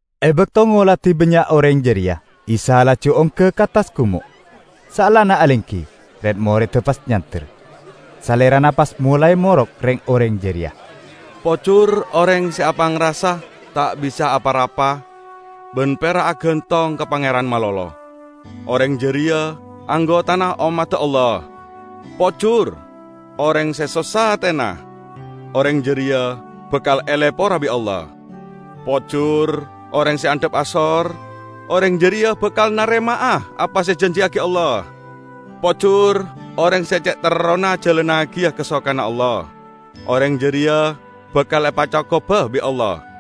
E bakto ngoladi bannya' oreng jareya, Isa laju ongga ka attas gumo'. Saellana alenggi, red-moredda pas nyander. Salerana pas molae morok reng-oreng jareya: "Pojur oreng se apangrasa ta' bisa apa-rapa ban pera' agantong ka Pangeran malolo; oreng jareya anggotana ommadda Allah! Pojur oreng se sossa atena; oreng jareya bakal elepora bi' Allah! Pojur oreng se andhap asor; oreng jareya bakal narema'a apa se ejanjiyagi Allah! Pojur oreng se ce' terrona ajalannagiya kasokanna Allah; oreng jareya bakal epacokoba bi' Allah!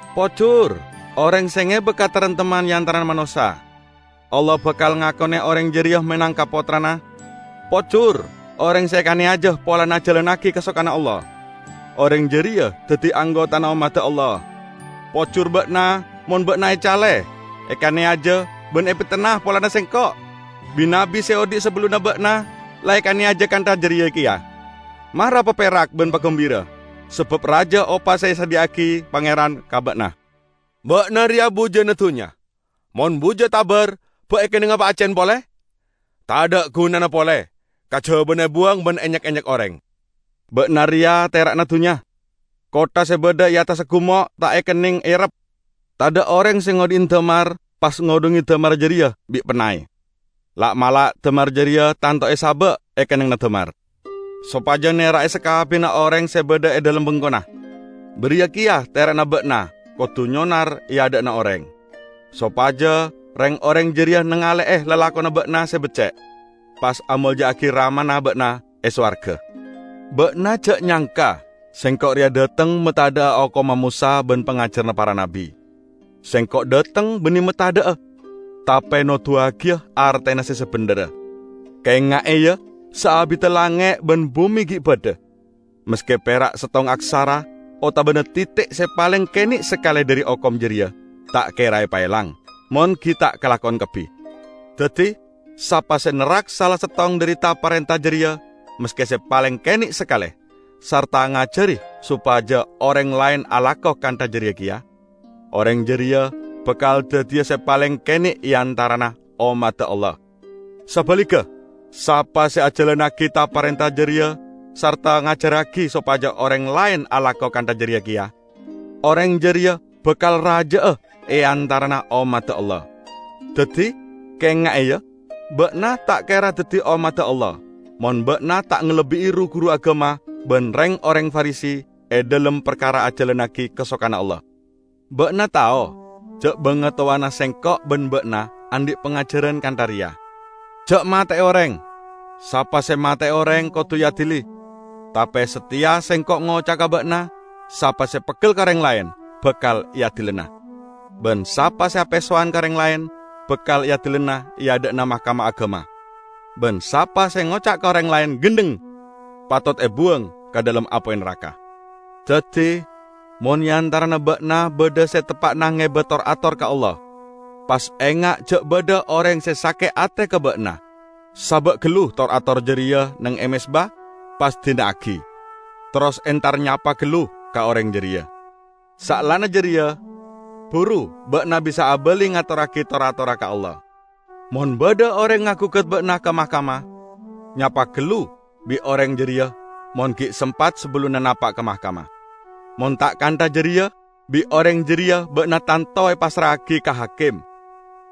Pojur oreng se ngeba kataremtemman e antarana manossa; Allah bakal ngakone oreng jareya menangka pottrana! Pojur oreng se ekaneyaja polana ajalannagi kasokanna Allah; oreng jareya daddi anggotana ommadda Allah! Pojur ba'na mon ba'na ecale, ekaneyaja ban epetenna polana Sengko'. Bi-nabbi se odhi' sabellunna ba'na la ekaneyaja kantha jareya keya. Mara paperak ban pagumbira, sabab raja opa se esadhiya'agi Pangeran ka ba'na." "Ba'na reya bujana dunnya. Mon buja tabar, ba' ekennenga epaaccen pole? Tadha' gunana pole, kajabana ebuwang ban enyek-enyek oreng. Ba'na reya tera'na dunnya. Kottha se badha e attassa gumo' ta' ekenneng errep. Tadha' oreng se ngodhi'i damar, pas ngodhunge damarra jareya bi' pennay. La'-mala' damar jareya tanto esaba' e kennengnganna damar, sopaja nera'e sakabbiyanna oreng se badha e dhalem bengkona. Bariya keya tera'na ba'na kodu nyonar e adha'na oreng, sopaja reng-oreng jareya nangale'e lalakonna ba'na se becce', pas amolja'agi Ramana ba'na e sowarga." "Ba'na ja' nyangka Sengko' reya dhateng matadha'a hokomma Mosa ban pangajaranna para nabbi. Sengko' dhateng banne matadha'a, tape noduwagiya artena se sabendherra. Kaenga'e, ya! Saabidda langnge' ban bume gi' badha, maske pera' settong aksara otabana titi' se paleng kene' sakale dhari hokom jareya ta' kera epaelang, mon gi' ta' kalakon kabbi! Daddi, sapa se nerrak sala settong dhari ta-parenta jareya, maske se paleng kene' sakale, sarta ngajari sopaja oreng laen alako kantha jareya keya, oreng jareya bakal daddiya se paleng kene' e antarana ommadda Allah. Sabaligga, sapa se ajalannagi ta-parenta jareya sarta ngajarragi sopaja oreng laen alako kantha jareya keya, oreng jareya bakal raja'a e antarana ommadda Allah. Daddi, kaenga'e, ya: Ba'na ta' kera daddi ommadda Allah mon ba'na ta' ngalebbi'i ru-guru agama ban reng-oreng Farisi e dhalem parkara ajalannagi kasokanna Allah!" "Ba'na tao ja' bangatowana Sengko' ban ba'na andhi' pangajaran kantha reya: Ja' mate'e oreng; sapa se mate'e oreng, kodu eadili. Tape sateya Sengko' ngoca'a ka ba'na, sapa se peggel ka oreng laen, bakal eadilana; ban sapa se apesowan ka oreng laen, bakal eadilana e adha'na Mahkamah Agama. Ban sapa se ngoca' ka oreng laen 'Gendheng!', patot ebuwang ka dhalem apoy naraka. Daddi, mon e antarana ba'na badha se teppa'na ngeba tor-ator ka Allah, pas enga' ja' badha oreng se sake' ate ka aba'na, saba' gallu tor-atorra jareya neng e mezba pas dina'agi, terros entar nyapa gallu ka oreng jareya. Saellana jareya, buru ba'na bisa abali ngatorragi tor-atorra ka Allah. Mon badha oreng agugat ba'na ka mahkamah, nyapa gallu bi' oreng jareya mon gi' sempat sabellunna napa' ka mahkamah. Mon ta' kantha jareya, bi' oreng jareya ba'na tanto epassra'agi ka hakim,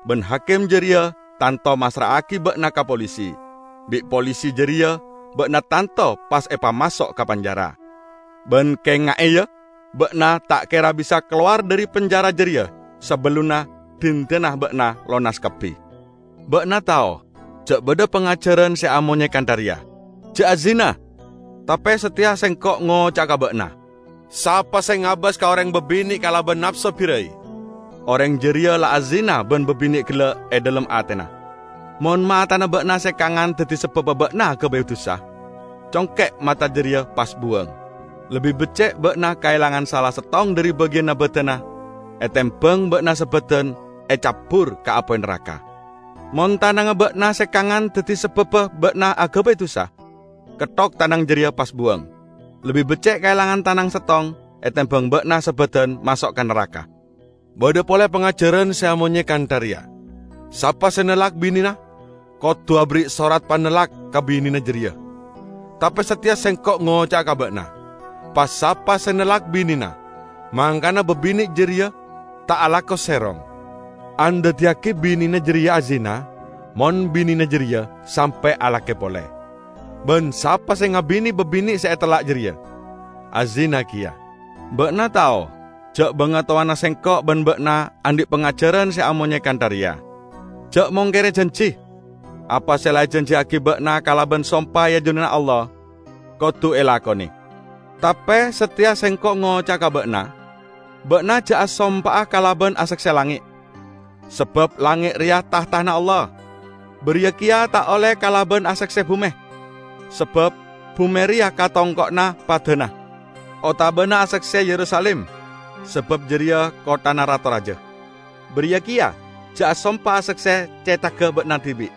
ban hakim jareya tanto massra'agi ba'na ka polisi. Bi' polisi jareya ba'na tanto pas epamaso' ka penjara. Ban kaenga'e, ya: Ba'na ta' kera bisa kalowar dhari penjara jareya, sabellunna dhindhana ba'na lonas kabbi." "Ba'na tao ja' badha pangajaran se amonye kantha reya: Ja' azina. Tape sateya Sengko' ngoca'a ka ba'na: sapa se ngabas ka oreng babine' kalaban napso barai, oreng jareya la azina ban babine' gella' e dhalem atena. Mon matana ba'na se kangan daddi sababba ba'na agabay dusa, congke' mata jareya pas buwang! Lebbi becce' ba'na kaelangan sala settong dhari bagiyanna badanna etembang ba'na sabadan ecabbur ka apoy naraka. Mon tanangnga ba'na se kangan daddi sababba ba'na agabay dusa, ketthok tanang jareya pas buwang! Lebbi becce' kaelangan tanang settong etembang ba'na sabadan maso' ka naraka." "Badha pole pangajaran se amonye kantha reya: sapa se nellak binena kodu aberri' sorat panellak ka binena jareya. Tape sateya Sengko' ngoca'a ka ba'na: pa-sapa se nellak binena mangkana babine' jareya ta' alako serong, andaddiyagi binena jareya azina, mon binena jareya sampe' alake pole. Ban sapa se ngabine babine' se etellak jareya, azina keya." "Ba'na tao ja' bangatowana Sengko' ban ba'na andhi' pangajaran se amonye kantha reya: ja' mongkere janji. Apa se la ejanjiyagi ba'na kalaban sompa e ajunanna Allah, kodu elakone. Tape sateya Sengko' ngoca'a ka ba'na: ba'na ja' asompa'a kalaban asakse langnge', sabab langnge' reya tahtana Allah, bariya keya ta' olle kalaban asakse bume, sabab bume reya katongko'anna padana; otabana asakse Yerusalim, sabab jareya kotthana Rato raja. Bariya keya ja' asompa asakse cethagga ba'na dibi',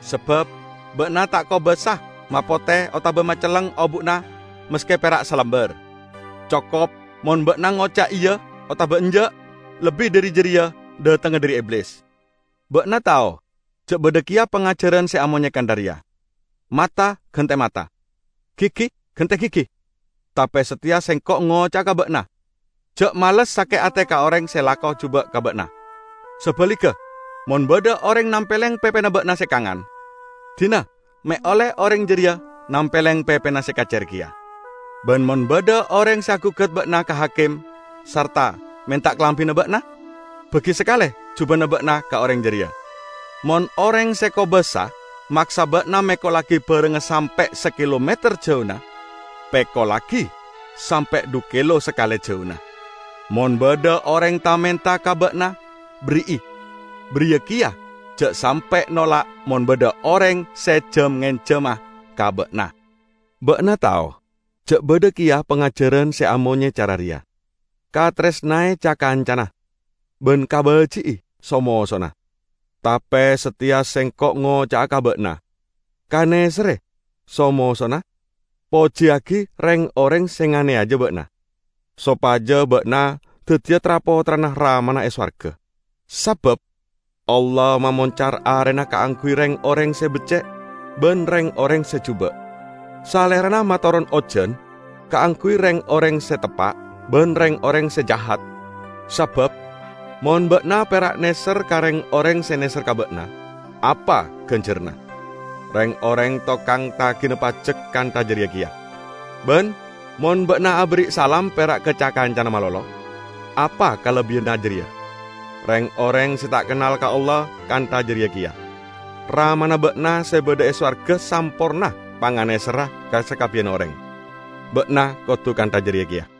sabab ba'na ta' kobasa mapote otaba macelleng obu'na maske pera' salambar. Cokop mon ba'na ngoca' 'Iya' otaba 'Enja'' -- lebbi dhari jareya dhatengnga dhari Iblis." "Ba'na tao ja' badha keya pangajaran se amonye kantha reya: mata gante mata, gigi gante gigi. Tape sateya Sengko' ngoca'a ka ba'na: ja' males sake' ate ka oreng se alako juba' ka ba'na. Sabaligga, mon badha oreng nampeleng pepena ba'na se kangan, dina me' olle oreng jareya nampeleng pepena se kacer keya. Ban mon badha oreng se agugat ba'na ka hakim sarta menta kalambina ba'na, bagi sakale jubana ba'na ka oreng jareya. Mon oreng se kobasa maksa ba'na mekollagi barangnga sampe' sakilometer jauna, pekollagi sampe' dhu kilo sakale jauna. Mon badha oreng ta-menta ka ba'na, berri'i. Bariya keya ja' sampe' nolak mon badha oreng se jam-ngenjama ka ba'na." "Ba'na tao ja' badha keya pangajaran se amonye cara reya: kataresnae ca-kancana ban kabaji'i so-mosona. Tape sateya Sengko' ngoca'a ka ba'na: kaneserre so-mosona, pojiyagi reng-oreng se nganeyaja ba'na, sopaja ba'na daddiya tra-pottrana Ramana e sowarga. Sabab Allah mamoncar arena kaangguy reng-oreng se becce' ban reng-oreng se juba'. Salerana matoron ojan kaangguy reng-oreng se teppa' ban reng-oreng se jahat. Sabab mon ba'na pera' neser ka reng-oreng se neser ka ba'na, apa ganjaranna? Reng-oreng tokang tagina pajek kantha jareya keya. Ban mon ba'na aberri' salam pera' ka ca-kancana malolo, apa kalebbiyanna jareya? Reng-oreng se ta' kennal ka Allah kantha jareya keya! Ramana ba'na se badha e sowarga samporna panganeserra ka sakabbiyanna oreng. Ba'na kodu kantha jareya keya."